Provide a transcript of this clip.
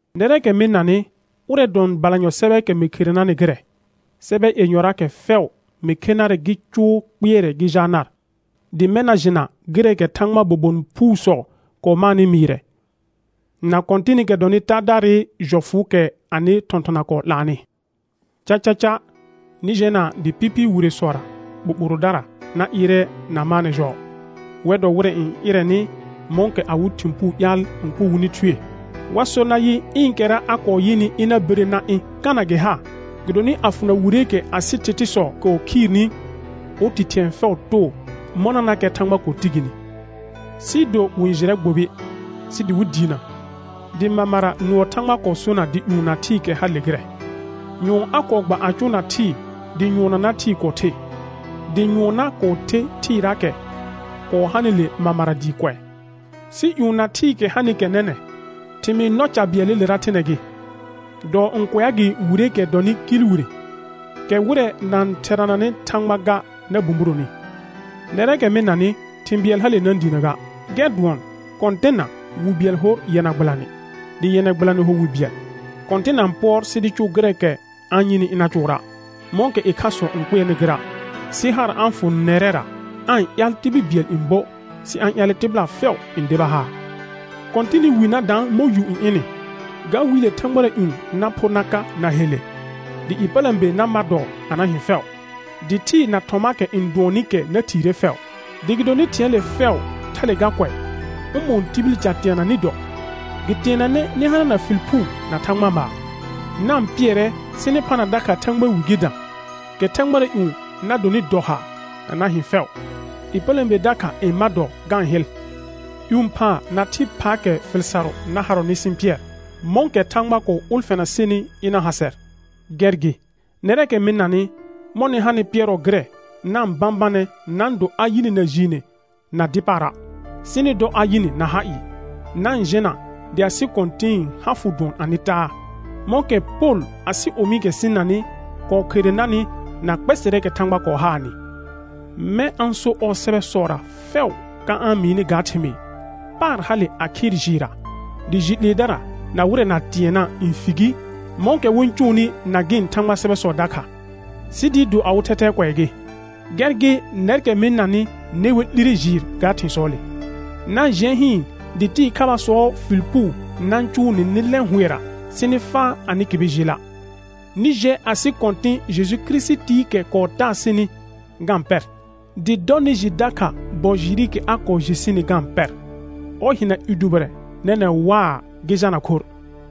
Nɛrɛɛkɛ mɩ-n nanɩ, ʋrɛ dʋɔn balanyɔ sɛbɛɛkɛ mɩ khere narnɩ gɩrɛ. Sɛbɛ yenyɔraakɛ fɛʋ mɩ khe narɛ gɩ cʋʋ kpɩɛrɛ gɩ jaa nar; dɩ mɛ̃ na jɩna gɩrɛɛkɛ Thãgbaa bobon phuusɔ kɔɔ maanɩ mɩɩrɛ, na Kɔ̃tɩnɩkɛ dɔnɩ Taadaarɩ jɔfʋʋkɛ anɩ thɔ̃thɔna kɔɔ 'laanɩ. Cacaca nɩ jɛna dɩ pɩpɩɩ wiresɔra ɓoɓorodara na ɩɩrɛ na maanɛ jɔɔ. Wɛr dɔ wɩrɛ n ɩrɛnɩ mɔ̃kɛ awɩ thɩ̃ puu ƴaal n kʋ wɩnɩ thue. Wa sor nayɩ: Ɩɩnkɛra a kɔɔ yɩnɩ ɩna bire na ɩ̃, kana gɩ ha? Gɩdonɩ a fʋna wireekɛ asɩ thɩthɩsɔ kɔɔ khiirni, oti thɩ̃ɛ fɛʋ too mɔnanakɛ Thãgba kɔɔ ti gini. Sɩɩ do wɩ-n jɩrɛ gbobi, sɩ dɩ wɩ diinə, dɩ mamara nʋɔ Thãgba kɔɔ sona dɩ ƴũ na thɩɩkɛ hale gɩrɛ. Nyʋɔn a kɔɔ gba a cʋʋna thɩɩ dɩ nyʋɔnnana thɩɩ kɔɔ the. Dɩ nyʋɔnna kɔɔ the thɩɩraakɛ kɔɔ hanɩle mamara dɩɩ kʋɛ. Sɩ ƴũ na thɩɩkɛ hanɩkɛ nɛnɛ̃, thɩmɩɩ nɔ ca bɩɛlɩlera thɩnɛ gɩ, dɔɔ n kʋɛa gɩ wireekɛ dɔnɩ kɩɩl wire, kɛ wɩrɛ na-n therananɩ Thãgba ga na bũburoni. Nɛrɛɛkɛ mɩ-n nanɩ, thɩ̃ bɩɛl hale na-n diinə ga, gɛr dʋɔn, Kɔ̃tɩnna wi bɩɛl hor yɛna gbɩlanɩ, dɩ yɛna gbɩlanɩ ho wi bɩɛl. Kɔ̃tɩn na-n pʋɔr sɩ dɩ cʋʋ gɩrɛɛkɛ a-n yɩnɩ ɩna cʋʋra', mɔ̃kɛ ɩkhasɔ n kpɩɛrnɩ gɩra', sɩ haar a-n fʋ nɛrɛra aa-n ƴaal tibil bɩɛl n buə', sɩ a-n ƴaalɛ tɩbɩla fɛʋ n deba haar. Kɔ̃tɩnɩ wi na daan mɔ̃ yu n ɩnɩ, ga Wiile thãgbara ƴũ na phor na ka na helle, dɩ ƴepələ̃be na mar dɔɔ a na hɩ̃ fɛʋ, dɩ thɩɩ na thɔmaakɛ n dʋɔnnɩ kɛ na thiire fɛʋ. Dɩ gɩdonɩ thɩ̃ɛɛle fɛʋ thale ga kʋɛ, ʋmɔ̃ɔ tibil ca teana nɩ dɔ? Gɩ teenanɛ nɩ hanana fɩl phuu na Thãgba maar. Na-n pɩɛrɛ sɩ nɩ phana dakha Thãgbaa wi gɩ dã, kɛ thãgbara ƴũ na donɩ dɔ haar a na hɩ̃ fɛʋ, ƴepələ̃be dakha n ma dɔɔ ga-n hɩl. Ƴũ phaa na thɩ phaakɛ fɩl sarʋ na harɔnɩ sɩ-n pɩɛr, mɔ̃kɛ Thãgba kɔɔ ʋlfɛna sɩnɩ ɩna ha sɛr. Gɛr gɩ, nɛrɛɛkɛ mɩ-n nanɩ, mɔ̃ nɩ hanɩ pɩɛrɔ gɩrɛ, na-n bãbanɛ na-n do a yɩ nɩ na jiine na dɩ paara', sɩ nɩ dɔ a yɩ nɩ na ha ɩɩ. Na-n jɛna dɩ asɩ Kɔ̃tɩ̃ɩ ha fʋ dʋɔn anɩ taa, mɔ̃kɛ Pol asɩ omiikɛ sɩ-n nanɩ kɔɔ khere narnɩ na kpɛsɛrɛɛkɛ Thãgba kɔɔ haanɩ. Mɛ̃ a-n so ɔɔ sɛbɛsɔra fɛʋ ka a-n mɩɩnɩ ga thɩmɩɩ. Paar hale a khɩɩr jɩɩrra, dɩ jɩ 'leedara na wɩrɛ na tɩɛnna' n fi gi mɔ̃kɛ wɩ-n cʋʋnɩ na gɩ̃ Thãgbaa sɛbɛsɔ dakha, sɩ dɩɩ do awɩ thɛthɛɛ kʋɛ gɩ. Gɛr gɩ nɛrkɛ mɩ-n nanɩ, ne wer 'lire jɩɩr ga thɩ̃sɔɔle; na-n jɩɛ hɩɩn dɩ tɩɩ khabaasɔɔ fɩl puu na-n cʋʋ nɩ nɩ lɛ̃ hʋɛra sɩ nɩ faa anɩ kɩbɩ jɩɩla'. Nɩ jɛ asɩ Kɔ̃tɩ̃ Jeju Kirisitiikɛ kɔɔ taa sɩnɩ ga-n pɛr, dɩ dɔ nɩ jɩ dakha bɔ jɩɩrɩkɛ a kɔɔ jɩ sɩnɩ ga-n pɛr. Ɔr hɩna i dʋbɩrɛ nɛnɛ̃ waa, gɩ jalna khorr.